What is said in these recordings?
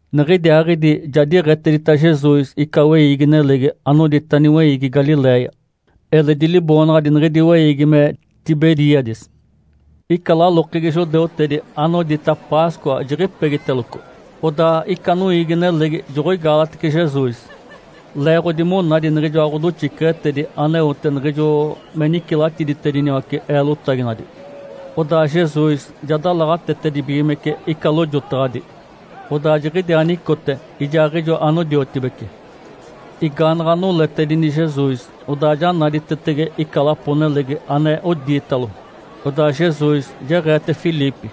Niɡ̶idiaaɡ̶idi ja diɡ̶etedita Jesus ica weiigi-nelegi anodita “Niweiigi Galiléia”. Eledi liboonaɡ̶adi niɡ̶idi weiigi me Tiberíades. Ica lalokegi judeutedi anodita Páscoa jiɡ̶ipegiteloco. Odaa ica noiigi-nelegi joɡ̶oigaalatece Jesus, leeɡ̶odi monadi niɡ̶ijoa ɡ̶odoxiceɡ̶etedi aneote niɡ̶ijo me nicilatiditediniwace eelotaginadi. Odaa Jesus ja dalaɡ̶atetedibigimece ica lojotaɡ̶adi, odaa jiɡ̶idiaa nicote ijaaɡ̶ijo anodiotibece. Igaanaɡ̶a noletedini Jesus, odaa ja naditetege ica lapo-nelegi ane odiitalo. Odaa Jesus jeɡ̶eete Filipe,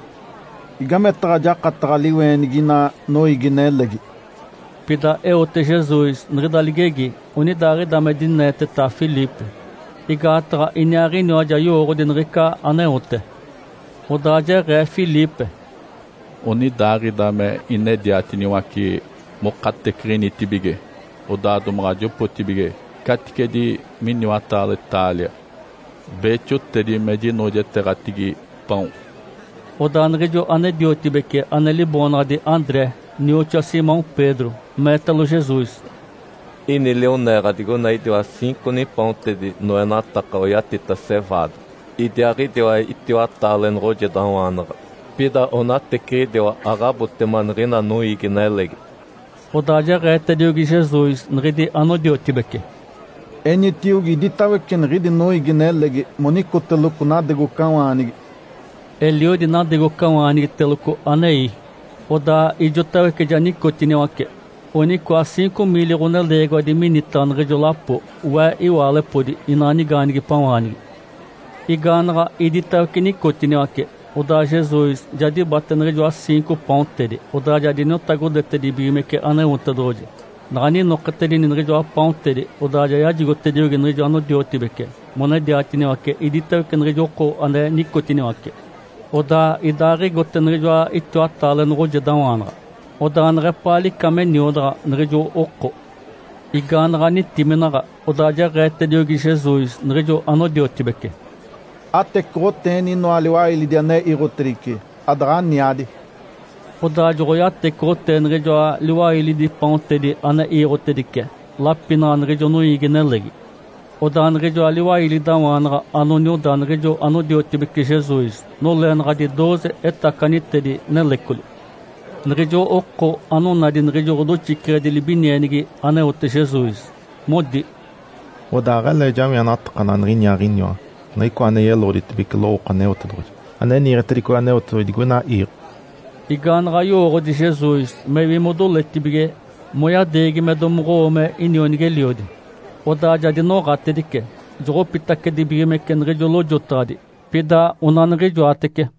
“Igametaɡ̶a jakataɡ̶a liweenigi ina noiigi-nelegi?” Pida eote Jesus niɡ̶ida ligegi onidaaɡ̶ida me dineeteta Filipe, igaataɡ̶a Iniaaɡ̶iniwa ja yowooɡ̶odi niɡ̶ica aneote. Odaa jeɡ̶ee Filipe, “Onidaaɡ̶ida me inedianaɡ̶atiniwace mokateciɡ̶initibige, odaa domaɡ̶a jopooɡ̶atibige caticedi miniwata taalia beexotedi me jinoojeteeɡ̶atigi paon”. Odaa niɡ̶ijo ane-diotibece, ane liboonaɡ̶adi André, nioxoa Simão Pedro, meetalo Jesus, “Ini lioneeɡ̶a digoina idiwa ciinco nipaontedi noenataka oyatita ‘cevaada’, idiaaɡ̶idiwa itiwataale noɡ̶ojedawaanaɡ̶a. Pida onateciɡ̶idiwa aɡ̶abotema niɡ̶ina noiigi-nelegi”. Odaa jeɡ̶eetediogi Jesus niɡ̶idi anodiotibece, “Enitiogi iditawece niɡ̶idi noiigi-nelegi monicoteloco nadegocawaanigi”. Eliodi nadegocawaanigiteloco anei. Odaa ijotawece ja nicotiniwace. Onicoa ciinco miili ɡ̶oneleegiwadi minitaɡ̶a niɡ̶ijo lapo (we iwaalepodi inaa nigaanigipawaanigi). Igaanaɡ̶a iditawece nicotiniwace, odaa Jesus ja dibate niɡ̶ijoa ciinco paontedi, odaa ja diniotagodetedibigimece Aneotedoɡ̶oji. Naɡ̶a ninoketedini niɡ̶ijoa paontedi, odaa ja yajigotediogi niɡ̶ijo anodiotibece monediatiniwace iditawece niɡ̶ijo oko ane nicotiniwace. Odaa idaaɡ̶igote niɡ̶ijoa itiwataale noɡ̶ojedawaanaɡ̶a. Odaa neɡ̶epaa lica me niodaɡ̶a niɡ̶ijo oko. Igaanaɡ̶a nitiminaɡ̶a, odaa jeɡ̶eetediogi Jesus niɡ̶ijo anodiotibece, “Atecoɡ̶oteeni inoa liwailidi ane iiɡ̶otedice adaɡ̶aniadi”. Odaa joɡ̶oyatecoɡ̶otee niɡ̶ijoa liwailidi paontedi ane iiɡ̶otedice lapinaɡ̶a niɡ̶ijo noiigi-nelegi. Odaa niɡ̶ijoa liwailidawaanaɡ̶a anonioda niɡ̶ijo anodiotibece Jesus noleenaɡ̶adi dooze etacanitedi nelecoli. Niɡ̶ijo oko anonadi niɡ̶ijo ɡ̶odoxiceɡ̶edi libinienigi aneote Jesus, modi, “Odaa aɡ̶alee jawienatakanaɡ̶a niɡ̶iniaaɡ̶iniwa, Niɡ̶icoa ane yeloɡ̶oditedibece lowooko Aneotedoɡ̶oji, ane niiɡ̶etedicogi Aneotedoɡ̶oji digoina iiɡ̶o”. Igaanaɡ̶a yowooɡ̶odi Jesus mewi modoletibige moyadeegi me domoɡ̶owo me inionigi-eliodi, odaa ja dinoɡ̶atedice, joɡ̶opitacedibigimece niɡ̶ijo lojotaɡ̶adi, pida onaniɡ̶ijoatece.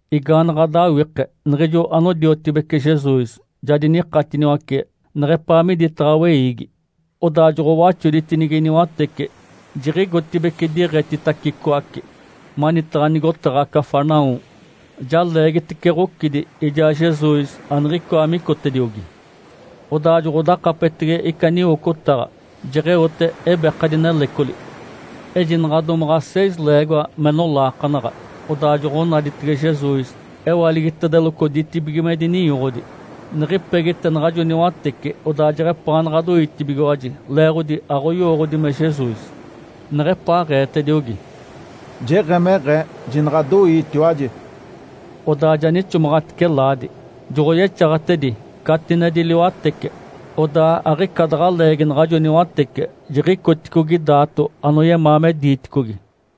Igaanaɡ̶a dawike, niɡ̶ijo anodiotibece Jesus ja dinikatiniwace neɡ̶epaa miditaɡ̶a weiigi. Odaa joɡ̶owaxoditinigi niwatece, jiɡ̶igotibeci diɡ̶etitacicoace manitaɡ̶a nigotaɡ̶a Cafarnaum. Ja leegitece ɡ̶ocidi, ijaa Jesus aniɡ̶icoa micotediogi. Odaa joɡ̶odakapetege ica niwocotaɡ̶a, jeɡ̶eote ebekadi nelecoli. Ejinaɡ̶a domaɡ̶a seis leegoa me nolaakanaɡ̶a, odaa joɡ̶onaditege Jesus. Ewaligitedeloco ditibigimedi ninyoɡ̶odi. Niɡ̶ipegite naɡ̶ajo niwatece, odaa jeɡ̶epaanaɡ̶a doitibigiwaji, leeɡ̶odi aɡ̶oyowooɡ̶odi me Jesus. Neɡ̶epaaɡ̶eetediogi, “Jeɡ̶emeɡ̶ee. Jinaɡ̶adoiitiwaji!” Odaa ja nixomaɡ̶atice laadi, joɡ̶oyexaɡ̶atedi catinedi liwatece. Odaa aɡ̶ica daɡ̶a leegi naɡ̶ajo niwatece jiɡ̶icoticogi daato anoyemaa me diiticogi.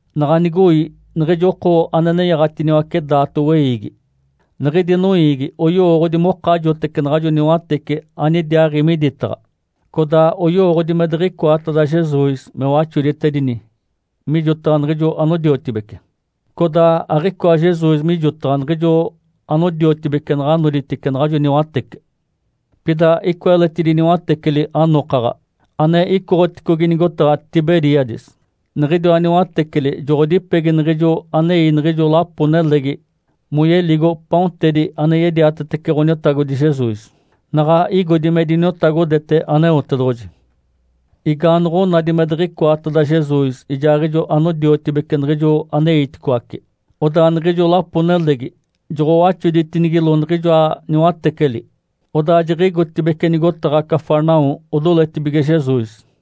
Naɡ̶a nigoi niɡ̶ijo oko ane nenyaɡ̶atiniwace daato weiigi, niɡ̶idi noiigi oyowooɡ̶odi mokajotece naɡ̶ajo niwatece anidiaaɡ̶i miditaɡ̶a. Codaa oyowooɡ̶odi me diɡ̶icoateda Jesus me waxoditedini mijotaɡ̶a niɡ̶ijo anodiotibece, codaa aɡ̶icoa Jesus mijotaɡ̶a niɡ̶ijo anodiotibece naɡ̶a noditice naɡ̶ajo niwatece. Pida icoa eletidi niwateceli anokaɡ̶a, ane icoɡ̶oticogi nigotaɡ̶a Tiberíades. Niɡ̶idiwa niwateceli joɡ̶odipegi niɡ̶ijo anei niɡ̶ijo lapo-nelegi moyeligo paontedi ane yediatetece Ǥoniotagodi Jesus, naɡ̶a igodi me diniotagodete Aneotedoɡ̶oji. Igaanoɡ̶onadi me diɡ̶icoateda Jesus ijaaɡ̶ijo anodiotibece niɡ̶ijo aneiticoace, odaa niɡ̶ijo lapo-nelegi joɡ̶owaxoditinigilo niɡ̶ijoa niwateceli, odaa jiɡ̶igotibeci nigotaɡ̶a Cafarnaum odoletibige Jesus.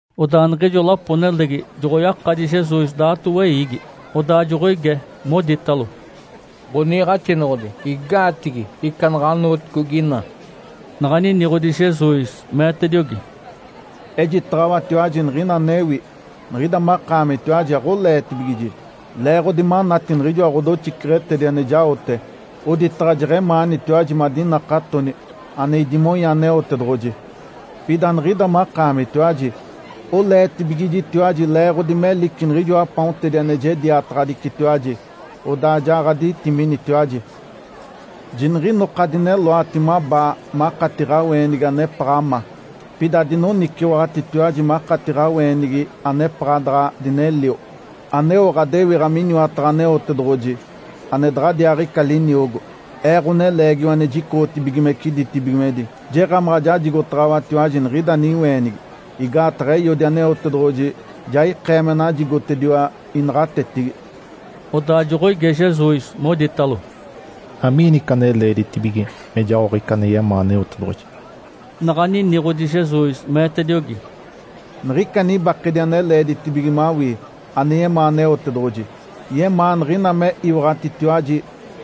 Odaa niɡ̶ijo lapo-nelegi joɡ̶oyakadi Jesus daato weiigi. Odaa joɡ̶oige, moditalo, “Ǥoniiɡ̶axinoɡ̶odi. Igaatigi ica naɡ̶anooticogi ina?” Naɡ̶a niniɡ̶odi Jesus, meetediogi, “Ejitaɡ̶awatiwaji niɡ̶ina anewi. Niɡ̶ida makaamitiwaji aɡ̶oleetibigiji leeɡ̶odi manati niɡ̶ijoa ɡ̶odoxiceɡ̶etedi ane jaote (oditaɡ̶a jeɡ̶emaanitiwaji madinakatoni ane idimonya Aneotedoɡ̶oji). Pida niɡ̶ida makaamitiwaji oleetibigijitiwaji leeɡ̶odi melici niɡ̶ijoa paontedi ane jediataɡ̶adicitiwaji, odaa ja ɡ̶aditiminitiwaji. Jiniɡ̶inoka adineloati mabaa makati ɡ̶aweenigi anepaɡ̶a ma. Pida adinoniciwaɡ̶atitiwaji makati ɡ̶aweenigi anepaɡ̶a daɡ̶a dinelio, aneo ɡ̶adewiɡ̶a miniwataɡ̶a Aneotedoɡ̶oji ane daɡ̶adiaaɡ̶ica liniogo. Ee, Ǥoneleegiwa ane jicoɡ̶otibigimece ditibigimedi, jeɡ̶emaɡ̶a jajigotaɡ̶awatiwaji niɡ̶ida niweenigi, igaataɡ̶a Eiodi, Aneotedoɡ̶oji, ja ikee me najigotediwa inaɡ̶atetigi.” Odaa joɡ̶oige Jesus, moditalo, “Amiini ica ane leeditibige me jaoɡ̶a ica ane yemaa Aneotedoɡ̶oji?” Naɡ̶a niniɡ̶odi Jesus, meetediogi, “Niɡ̶ica nibakedi ane leeditibige mawii, ane yemaa Aneotedoɡ̶oji, yemaa niɡ̶ina me iwaɡ̶atitiwaji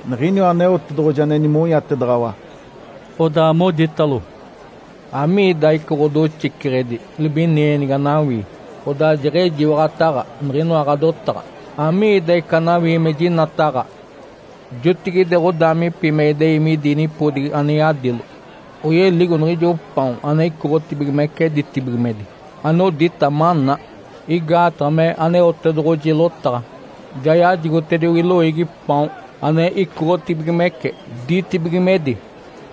niɡ̶iniwa Aneotedoɡ̶oji ane nimonyatedaɡ̶awa”. Odaa moditalo, “Amiida ica ɡ̶odoxiceɡ̶edi libinienigi anawii, odaa jeɡ̶ejiwaɡ̶ataɡ̶a niɡ̶inoa ɡ̶adotaɡ̶a? Amiida ica anawii me jinataɡ̶a? Jotigide ɡ̶odaamipi me idei midi nipodigi ane yadilo, oyeligo niɡ̶ijo paon ane icoɡ̶otibigimece ditibigimedi anodita ‘maná’. Igaataɡ̶a mee Aneotedoɡ̶oji lotaɡ̶a, ‘Ja yajigotediogi loiigi paon ane icoɡ̶otibigimece ditibigimedi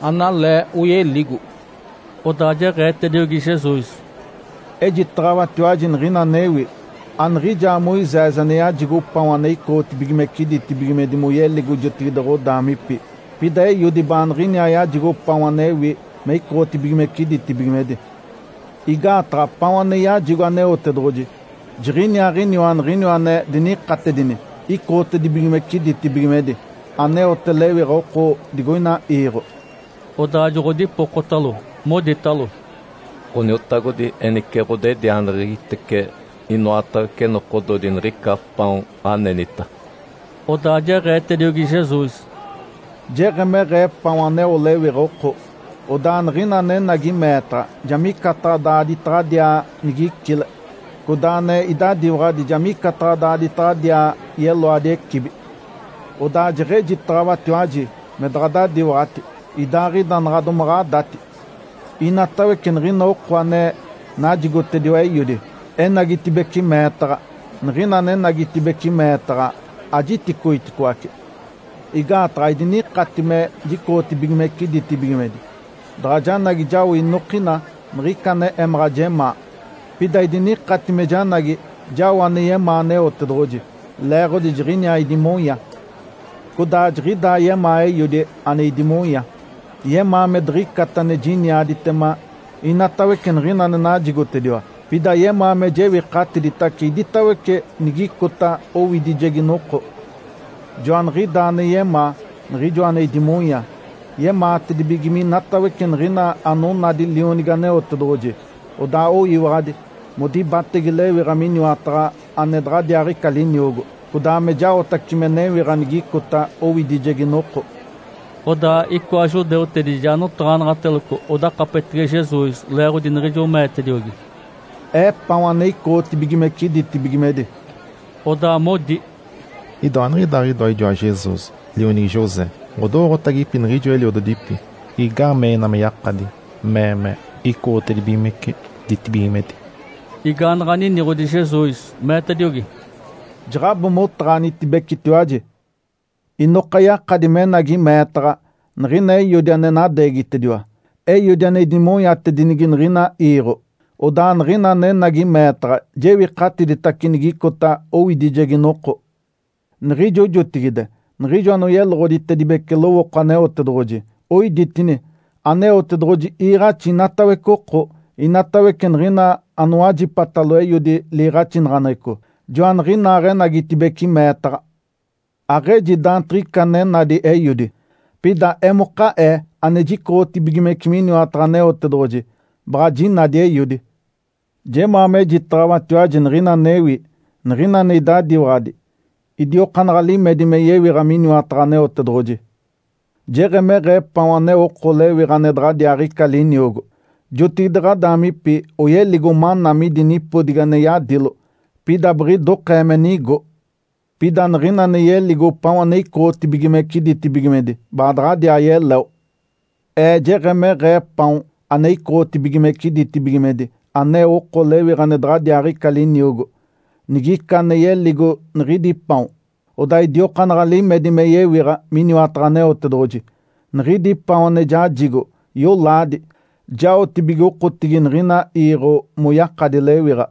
analee oyeligo’”. Odaa jeɡ̶eetediogi Jesus, “Ejitaɡ̶awatiwaji niɡ̶ina anewi. Aniɡ̶ijaa Moisés ane yajigo paon ane icoɡ̶otibigimece ditibigimedi moyeligo jotigide ɡ̶odaamipi. Pida Eiodi baaniɡ̶iniaa yajigo paon anewi me icoɡ̶otibigimece ditibigimedi. Igaataɡ̶a paon ane yajigo Aneotedoɡ̶oji jiɡ̶iniaaɡ̶iniwa niɡ̶iniwa ane dinikatedini icoɡ̶otedibigimece ditibigimedi, aneote lewiɡ̶a oko digoina iiɡ̶o”. Odaa joɡ̶odipokotalo, moditalo, “Ǥoniotagodi. Enice ɡ̶odedianeɡ̶egitece inoatawece nokododi niɡ̶ica paon anenita”. Odaa jeɡ̶eetediogi Jesus, “Jeɡ̶emeɡ̶ee paon aneo lewiɡ̶a oko. Odaa niɡ̶ina anenagi meetaɡ̶a ja micataɡ̶a daaditaɡ̶adiaa nigicile. Codaa ane idadiwaɡ̶adi ja micataɡ̶a daaditaɡ̶adiaa yeloadi ecibi. Odaa jeɡ̶ejitaɡ̶awatiwaji me daɡ̶adadiwaɡ̶ati, idaaɡ̶ida naɡ̶a domaɡ̶adati. Inatawece niɡ̶ina oko ane najigotediwa Eiodi, enagitibeci meetaɡ̶a. Niɡ̶ina anenagitibeci meetaɡ̶a, ajiticoiticoace. Igaataɡ̶a aidinikati me jicoɡ̶otibigimece ditibigimedi daɡ̶a janagi jao inokina niɡ̶ica ane emaɡ̶a jemaa, pida idinikati me janagi jao ane yemaa Aneotedoɡ̶oji, leeɡ̶odi jiɡ̶iniaa idimonya. Codaa jiɡ̶idaa yemaa Eiodi, ane idimonya. Yemaa me diɡ̶icata ane jiniaditema inatawece niɡ̶ina ane najigotediwa. Pida yemaa me jewikatiditace iditawece nigicota owidijegi noko. Joaniɡ̶idaa ane yemaa, Niɡ̶ijoa ane idimonya. Yemaatedibige minatawece niɡ̶ina anonadi Lionigi Aneotedoɡ̶oji, odaa oyiwaɡ̶adi, modibatege lewiɡ̶a miniwataɡ̶a ane daɡ̶adiaaɡ̶ica liniogo, codaa me jaotace me newiɡ̶a nigicota owidijegi noko”. Odaa icoa judeutedi ja notaɡ̶anaɡ̶ateloco odakapetege Jesus leeɡ̶odi niɡ̶ijo meetediogi, “Ee paon ane icoɡ̶otibigimece ditibigimedi”. Odaa modi, “Idoa aniɡ̶idaaɡ̶idoa ijoa Jesus, lionigi José? Ǥodowooɡ̶otagipi niɡ̶ijo eliododipi. Igaamee ina me yakadi mee me icoɡ̶otedibigimece ditibigimedi?” Igaanaɡ̶a niniɡ̶odi Jesus, meetediogi, “Jaɡ̶abo motaɡ̶anitibecetiwaji. Inoka yakadi menagi meetaɡ̶a, niɡ̶ina Eiodi ane nadeegitediwa. Eiodi ane idimonyatedinigi niɡ̶ina iiɡ̶o. Odaa niɡ̶ina anenagi meetaɡ̶a jewikatiditace nigicota owidijegi noko. Niɡ̶ijo jotigide niɡ̶ijo anoyeloɡ̶oditedibece lowooko Aneotedoɡ̶oji, oiditini, ‘Aneotedoɡ̶oji iiɡ̶axi inatawece oko’. Inatawece niɡ̶ina anowajipatalo Eiodi liiɡ̶axinaɡ̶aneɡ̶eco, joaniɡ̶inaaɡ̶enagitibeci meetaɡ̶a. Aɡ̶eji daantiɡ̶ica ane nadi Eiodi. Pida emoka Ee ane jicoɡ̶otibigimece miniwataɡ̶a Aneotedoɡ̶oji, baɡ̶a jinadi Eiodi. Jemaa mejitaɡ̶awatiwaji niɡ̶ina anewi. Niɡ̶ina ane idadiwaɡ̶adi idiokaanaɡ̶a limedi me yewiɡ̶a miniwataɡ̶a Aneotedoɡ̶oji. Jeɡ̶emeɡ̶ee paon aneo oko lewiɡ̶a ane daɡ̶adiaaɡ̶ica liniogo. Jotigide ɡ̶adaamipi oyeligo maná midi nipodigi ane yadilo. Pida biɡ̶idokee me nigo. Pida niɡ̶ina ane yeligo paon ane icoɡ̶otibigimece ditibigimedi baadaɡ̶adiaa yeleo. Ee jeɡ̶emeɡ̶ee paon ane icoɡ̶otibigimece ditibigimedi aneo oko lewiɡ̶a ane daɡ̶adiaaɡ̶ica liniogo. Nigica ane yeligo niɡ̶idi paon, odaa idiokaanaɡ̶a limedi me yewiɡ̶a miniwataɡ̶a Aneotedoɡ̶oji. Niɡ̶idi paon ane jajigo, yolaadi, jaotibige okotigi niɡ̶ina iiɡ̶o moyakadi lewiɡ̶a.”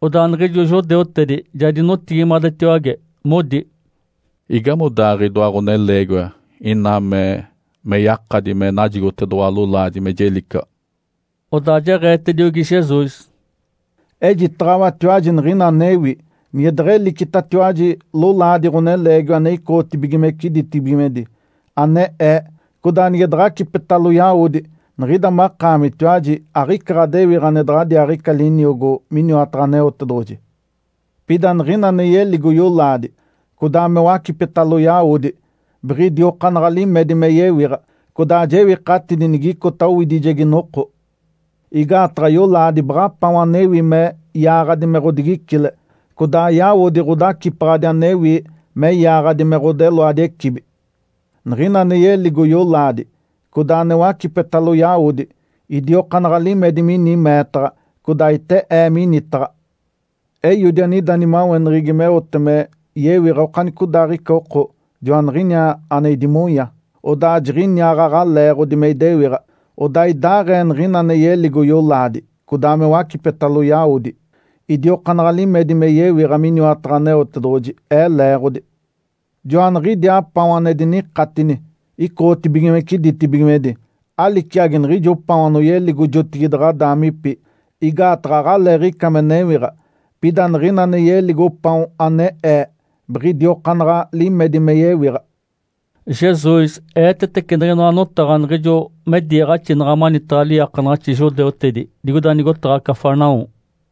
Odaa niɡ̶ijo judeutedi ja dinotigimadetiwage, modi, “Igamodaaɡ̶ee idoa ɡ̶oneleegiwa ina mee me yakadi me najigotedoɡ̶owa lolaadi me jelicaɡ̶a?” Odaa jeɡ̶eetediogi Jesus, “Ejitaɡ̶awatiwaji niɡ̶ina anewi. Nige deɡ̶elicitatiwaji lolaadi Ǥoneleegiwa ane icoɡ̶otibigimece ditibigimedi, ane Ee, codaa nige daɡ̶acipetalo yawodi, niɡ̶ida makaamitiwaji aɡ̶ica ɡ̶adewiɡ̶a ane daɡ̶adiaaɡ̶ica liniogo miniwataɡ̶a Aneotedoɡ̶oji. Pida niɡ̶ina ane yeligo yolaadi, codaa me wacipetalo yawodi, biɡ̶idiokaanaɡ̶a limedi me yewiɡ̶a. Codaa jewikatidi nigicota owidijegi noko. Igaataɡ̶a yolaadi baɡ̶a paon anewi me yaaɡ̶adi me ɡ̶odigicile, codaa yawodi ɡ̶odacipaɡ̶adi anewi me yaaɡ̶adi me ɡ̶odeloadi ecibi. Niɡ̶ina ane yeligo yolaadi, codaa ane wacipetalo yawodi, idiokaanaɡ̶a limedi mini meetaɡ̶a, codaa ite Ee minitaɡ̶a. Eiodi anida nimaweneɡ̶egi meote me yewiɡ̶a okanicodaaɡ̶ica oko, joaniɡ̶iniaa ane idimonya. Odaa jiɡ̶iniaaɡ̶aɡ̶a leeɡ̶odi me idewiɡ̶a. Odaa idaaɡ̶ee niɡ̶ina ane yeligo yolaadi, codaa me wacipetalo yawodi, idiokaanaɡ̶a limedi me yewiɡ̶a miniwataɡ̶a Aneotedoɡ̶oji, Ee leeɡ̶odi. Joaniɡ̶idiaa paon ane dinikatini icoɡ̶otibigimece ditibigimedi. Aliciagi niɡ̶ijo paon anoyeligo jotigide ɡ̶adaamipi, igaataɡ̶a aɡ̶aleeɡ̶ica me newiɡ̶a. Pida niɡ̶ina ane yeligo paon ane Ee biɡ̶idiokaanaɡ̶a limedi me yewiɡ̶a”. Jesus eetetece niɡ̶inoa notaɡ̶a niɡ̶ijo me diiɡ̶axinaɡ̶a manitaɡ̶a liiakanaɡ̶axi judeutedi digoida nigotaɡ̶a Cafarnaum.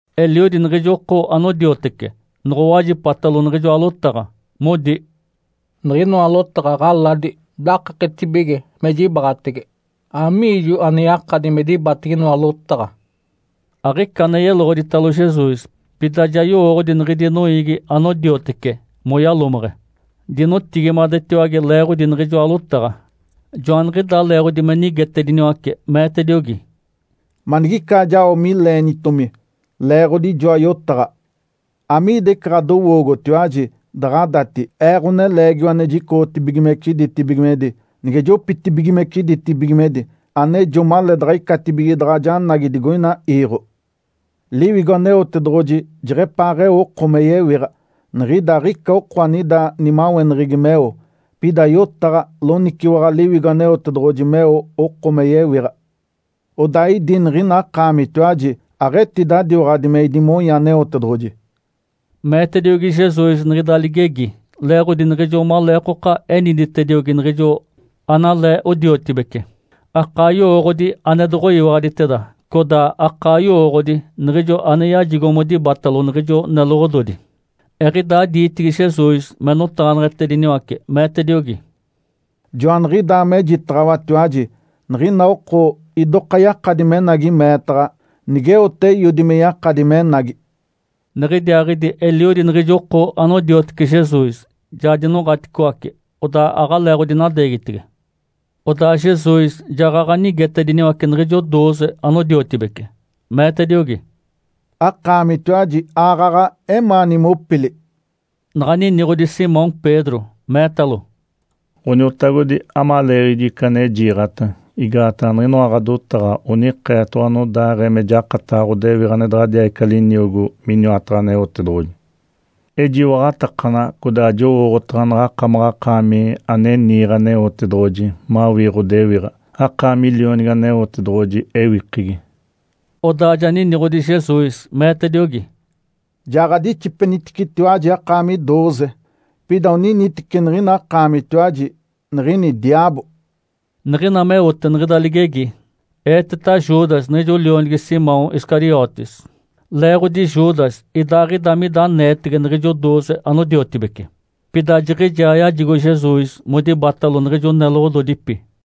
Eliodi niɡ̶ijo oko anodiotece noɡ̶owajipatalo niɡ̶ijoa lotaɡ̶a, modi, “Niɡ̶inoa lotaɡ̶a ɡ̶aladi, dakaketibige me jibaɡ̶atege. Amiijo ane yakadi me dibatege inoa lotaɡ̶a?” Aɡ̶ica ane yeloɡ̶oditalo Jesus, pida ja yowooɡ̶odi niɡ̶idi noiigi anodiotece moyalomeɡ̶e, dinotigimadetiwage leeɡ̶odi niɡ̶ijoa lotaɡ̶a. Joaniɡ̶idaa leeɡ̶odi me nigetediniwace, meetediogi, “Manigicaa jao mileenitomi leeɡ̶odi ijoa yotaɡ̶a? Amiida ica ɡ̶adowoogotiwaji daɡ̶adati Ee, Ǥoneleegiwa ane jicoɡ̶otibigimece ditibigimedi, nige jopitibigimece ditibigimedi anejo maleedaɡ̶a icatibige daɡ̶a janagi digoina iiɡ̶o? Liwigo Aneotedoɡ̶oji jeɡ̶epaaɡ̶eo oko me yewiɡ̶a. Niɡ̶ida aɡ̶ica oko anida nimaweneɡ̶egi meo. Pida yotaɡ̶a, loniciwaɡ̶awa Liwigo Aneotedoɡ̶oji meo oko me yewiɡ̶a. Odaa idi niɡ̶ina akaamitiwaji aɡ̶etidadiwaɡ̶adi me idimonya Aneotedoɡ̶oji”. Meetediogi Jesus niɡ̶ida ligegi leeɡ̶odi niɡ̶ijo maleekoka eniditediogi niɡ̶ijo analee odiotibece, akaa yowooɡ̶odi ane doɡ̶oyiwaɡ̶aditeda, codaa akaa yowooɡ̶odi niɡ̶ijo ane yajigo modibatalo niɡ̶ijo neloɡ̶ododi. Eɡ̶idaa diitigi Jesus me notaɡ̶aneɡ̶etediniwace, meetediogi, “Joaniɡ̶idaa mejitaɡ̶awatiwaji niɡ̶ina oko idoka yakadi menagi meetaɡ̶a, nigeote Eiodi me yakadi menagi”. Niɡ̶idiaaɡ̶idi eliodi niɡ̶ijo oko anodiotece Jesus ja dinoɡ̶aticoace, odaa aɡ̶aleeɡ̶odinadeegitege. Odaa Jesus jaɡ̶aɡ̶a nigetediniwace niɡ̶ijo dooze anodiotibece, meetediogi, “Akaamitiwaji aaɡ̶aɡ̶a emaani mopili?” Naɡ̶a niniɡ̶odi Simão Pedro, meetalo, “Ǥoniotagodi. Amaleeɡ̶aɡ̶ijo ica ane jiiɡ̶ata? Igaataɡ̶a niɡ̶inoa ɡ̶adotaɡ̶a onikeetoɡ̶owa anodaaɡ̶ee me jakataɡ̶a ɡ̶odewiɡ̶a ane daɡ̶adiaaɡ̶ica liniogo miniwataɡ̶a Aneotedoɡ̶oji. Ejiwaɡ̶atakanaɡ̶a codaa jowooɡ̶otaɡ̶a naɡ̶akamaɡ̶akaami ane niiɡ̶e Aneotedoɡ̶oji mawii ɡ̶odewiɡ̶a. Akaami Lionigi Aneotedoɡ̶oji ewikegi”. Odaa ja niniɡ̶odi Jesus, meetediogi, “Ja ɡ̶adixipeniticetiwaji akaami dooze. Pida oniniteci niɡ̶ina akaamitiwaji, niɡ̶ini diaabo”. Niɡ̶ina meote niɡ̶ida ligegi, eeteta Judas niɡ̶ijo lionigi Simão Iscariotes. Leeɡ̶odi Judas, idaaɡ̶ida mida aneetege niɡ̶ijo dooze anodiotibece, pida jiɡ̶ijaa yajigo Jesus modibatalo niɡ̶ijo neloɡ̶ododipi.